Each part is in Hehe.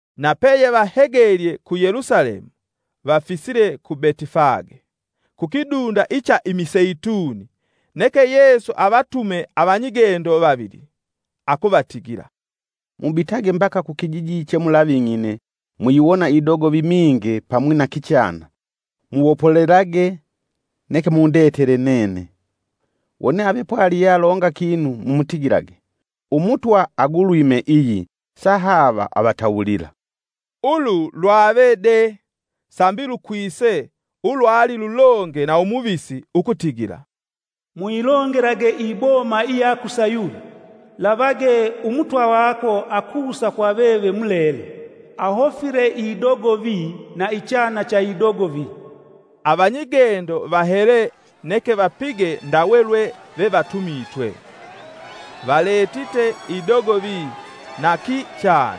Na peyevahegelye ku Yelusalemu vafisile ku Betifage, kukidunda icha imiseituni, neke Yesu avatume avanyigendo vavili. Akuvatigila, “Mubitage mbaka kukijiji che mulaving'ine muyiwona idogovi minge pamwi na kichana, muwopolelage neke mundetele nene. Wone ave pwali yealonga kinu mumutigilage: ‘Umutwa agulwime iyi,’ sahaava avatawulila.” Ulu lwave dee, sambi lukwise ulwali lulonge na umuvisi ukutigila, “Muyilongelage iboma iya ku Sayuni; lavage Umutwa vako akusa kwa veve mulele, ahofile idogovi, na ichana cha idogovi.” Avanyigendo vahele neke vapige ndawe lwe vevatumitwe. Valetite idogovi na kichana,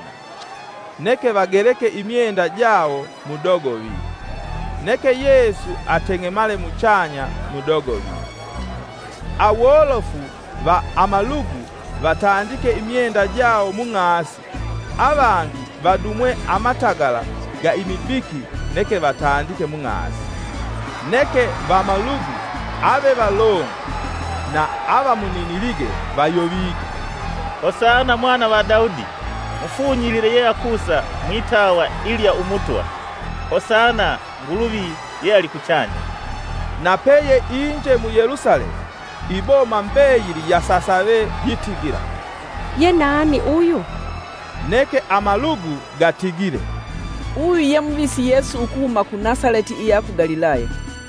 neke vageleke imyenda jawo mudogovi, neke Yesu ateng'emale muchanya mudogovi. Awolofu va amalugu vatandike imyenda jawo mung'asi, avangi vadumwe amatagala ga imibiki neke vatandike mung'asi. Neke vamalugu avevalongwe na avamuninilige vayovige: “Hosana Mwana va Daudi! Mufunyilile yeakusa mwitawa ilya Umutwa! Hosana Nguluvi yealikuchanya!” Na peye inje mu Yelusalemu, iboma mbeyili yasasave yitigila, “yenani uyu?” Neke amalugu gatigile, “Uyu ye Muvisi Yesu ukuhuma ku Nasaleti iya ku Galilaya.”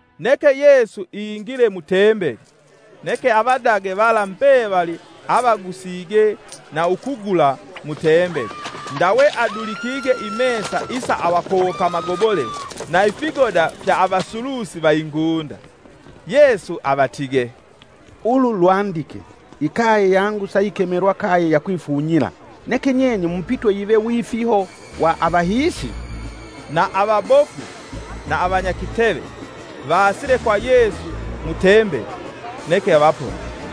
Neke Yesu ingile mu Tembeli, neke avadage vala mbevali avagusige na ukugula mu Tembeli ndawe adulikige imesa isa avakowoka amagobole na ifigoda fya avasulusi va ingunda. Yesu avatige, “Ulu lwandike: ‘Ikaye yangu sayikemelwa kaye ya kwifunyila.’ Neke nyenye mupitwe yive wifiho wa avahiisi.” Na avabofu na avanyakiteve vaasile kwa Yesu mu tembeli, neke avaponie.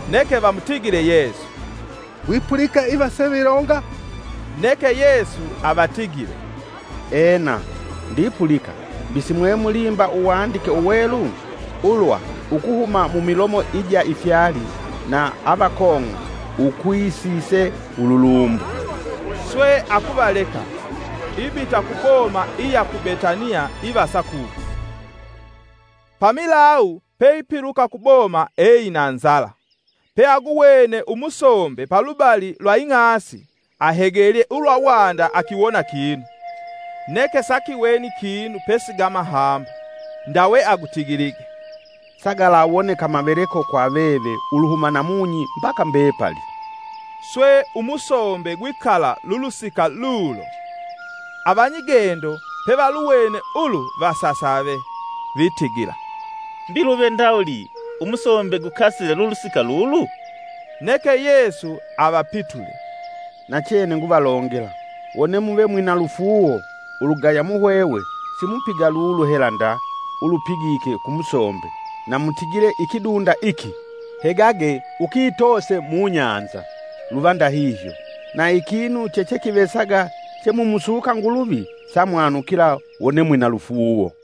Neke vamutigile Yesu, “Wipulika iva sevilonga?” Neke Yesu avatigile, “Ena; ndipulika mbi simwemulimba uwandike uwelu? ulwa ‘Ukuhuma mumilomo ija ifyali, na avakong'a, ukwisise ululumbo.’” Swe akuvaleka; ibita kuboma iya ku Betaniya ivasa kuko. Pamilawu peipiluka kuboma eina nzala. Peaguwene umusombe palubali lwa ing'asi, ahegelye ulwa wanda akiwona kinu, neke sakiweni kinu pesi gamahombo, ndawe agutigilige, “Sagalawoneka maveleko kwa veve uluhuma namunyi mbaka mbepali!” Swe umusombe gwikala lulusika lulo. Avanyigendo pevaluwene ulu vasasave, vitigila, “Mbi luve ndawuli umusombe gukasile lulusika lulu?” Neke Yesu avapitule, “Nachene nguvalongela, wone muve mwina lufuuwo, ulugaya muhwehwe, simupiga lulu hela nda ulupigike ku musombe, na mutigile ikidunda iki: ‘Hegage ukitoose mubahali,’ luva ndahihyo. Na ikinu chechekivesaga, chemumusuka Nguluvi samwanukila wone we mwina lufuuwo.”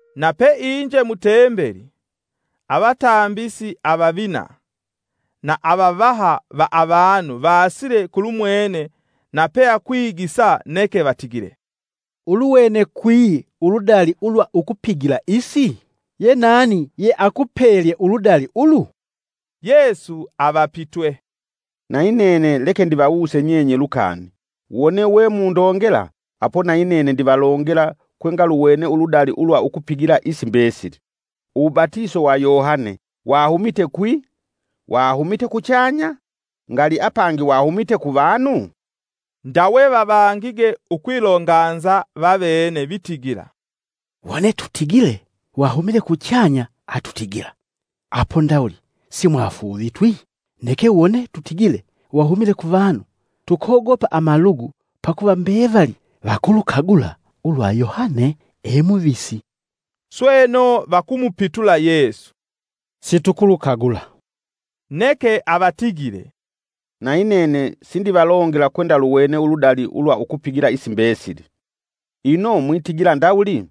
Na peinje mutembeli, avatambisi avavina na avavaha va avanu vaasile kulumwene na peakwigisa neke vatigile, “Uluwene kwi uludali ulwa ukupigila isi? yenani ye akupelye uludali ulu?” Yesu avapitwe, “Nayi nene leke ndivawuse nyenye lukani: wone we mundongela apo nayinene ndivalongela kwengaluwene uludali ulwa ukupigila isi mbesili. Uwubatiso wa Yohane wahumite kwi? Wahumite kuchanya? Ngali apangi wahumite kuvanu?” Ndawe vavangige ukwilonganza vavene vitigila: “Wone tutigile, ‘Wahumile kuchanya’, atutigila: Apo, ndawuli simwamufuuvitwi? Neke wone tutigile, ‘Wahumile kuvanu’, tukogopa amalugu, pakuva mbevali vakulukagula ulwa Yohane e muvisi.” Sweno vakumupitula Yesu, “situlukagula.” Neke avatigile, “Nayi nene sindivalongela kwendaluwene uludali ulwa ukupigila isi mbesili.” “Ino mwitigila ndawuli?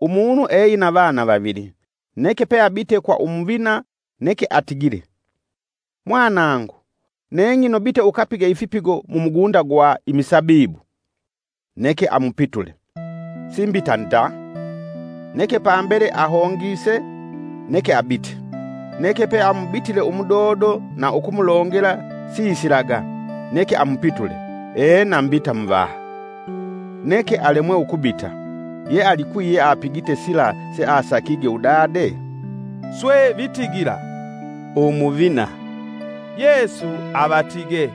Umunu eina vana vavili; neke pe abite kwa umuvina neke atigile, ‘Mwanangu neng'ino bite ukapige ifipigo mumugunda gwa imisabibu.’ Neke amupitule, ‘Si mbita nda!’ Neke pambele ahongise neke abite. Neke peamubitile umudodo na ukumulongela sisilaga; neke amupitule, ‘Ena mbita Muvaha!’ Neke alemwe ukubita. Ye alikwi yeapigite sila seasakige udade?” Swe vitigila, “Umuvina.” Yesu avatige,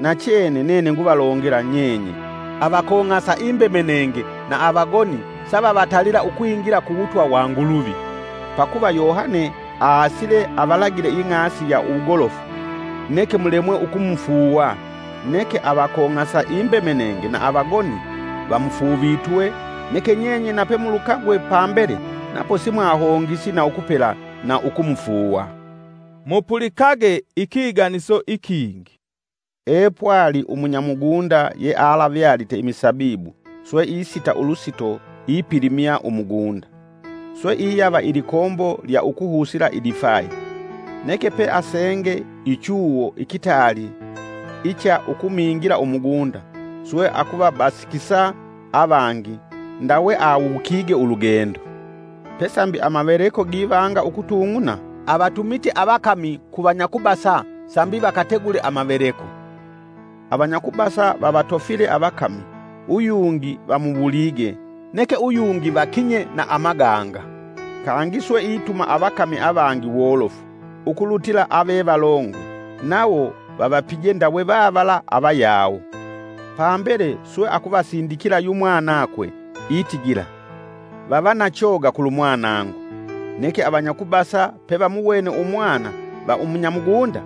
“Nachene nene nguvalongela nyenye avakong'asa imbemenenge na avagoni savavatalila ukwingila ku wutwa wa Nguluvi.” Pakuva Yohane aasile avalagile ing'asi ya uwugolofu, neke mulemwe ukumufuuwa neke avakong'sa imbemenenge na avagoni vamufuuvitwe; neke nyenye nape mulukagwe pambele napo simwahongisi na ukupela na ukumufuuwa. Mupulikage ikiganiso ikingi, “epwali umunya mugunda, yealavyalite imisabibu swe isita ulusito ipilimya umugunda, swe iyava ilikombo lya ukuhusila idifayi, neke pe asenge ichuwo ikitaali icha ukumingila umugunda swe akuvabasikisa avangi ndawe awukige ulugendo. Pe sambi amaveleko givanga ukutung'una avatumite avakami ku vanyakubasa sambi vakategule amaveleko. Avanyakubasa vavatofile avakami, uyungi vamuwulige, neke uyungi vakinye na amaganga. Kangi swe ituma avakami avangi wolofu ukulutila avevalongwe, nawo vavapije ndawe vavala avayawo. Pambele swe akuvasindikila yumwanakwe itigila; ‘Vava na choga kulumwanangu.’ Neke avanyakubasa pe vamuwene umwana va umunyamugunda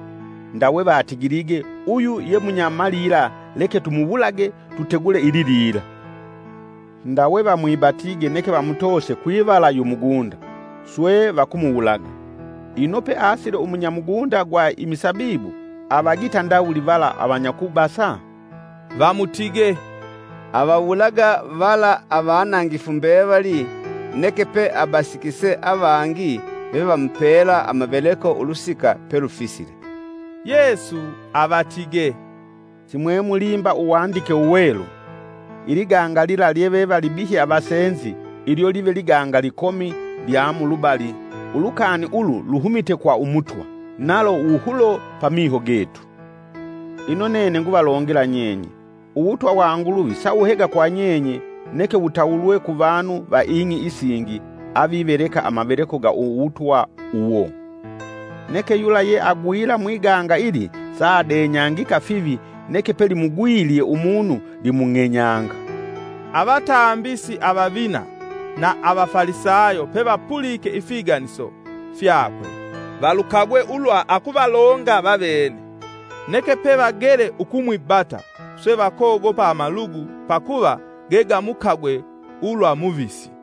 ndawe vatigilige uyu ye munya malila leke tumuwulage tutegule ililila. Ndawe vamwibatige neke vamutoose kwivala umugunda, swe vakumuwulaga. Ino peasile umunya mugunda gwa imisabibu, avagita ndawuli vala avanyakubasa?” Vamutige, “Avawulaga vala avanangifu mbevali, neke pe abasikise avangi vevamupela amaveleko ulusika pelufisile.” Yesu avatige, “Simwemulimba Uwandike Uwelu: ‘Iliganga lila lyevevalibihye avasenzi ilyo live liganga likomi lyamulubali; ulukani ulu luhumite kwa Umutwa, nalo wuhulo pamiho getu!’” Ino nene nguvalongela nyenye, uwutwa wa Nguluvi sawuhega kwa nyenye neke wutawulwe ku vanu va ing'i isingi aviveleka amaveleko ga uwutwa uwo. [ Neke yula ye agwila mwiganga ili saadenyangika fivi neke pelimugwilye umunu limung'enyanga.] Avatambisi avavina na avafalisayo pevapulike ifiganiso fyakwe valukagwe ulwa akuvalonga vavene. Neke pe vagele ukumwibata, swe vakogopa amalugu, pakuva gegamukagwe ulwa muvisi.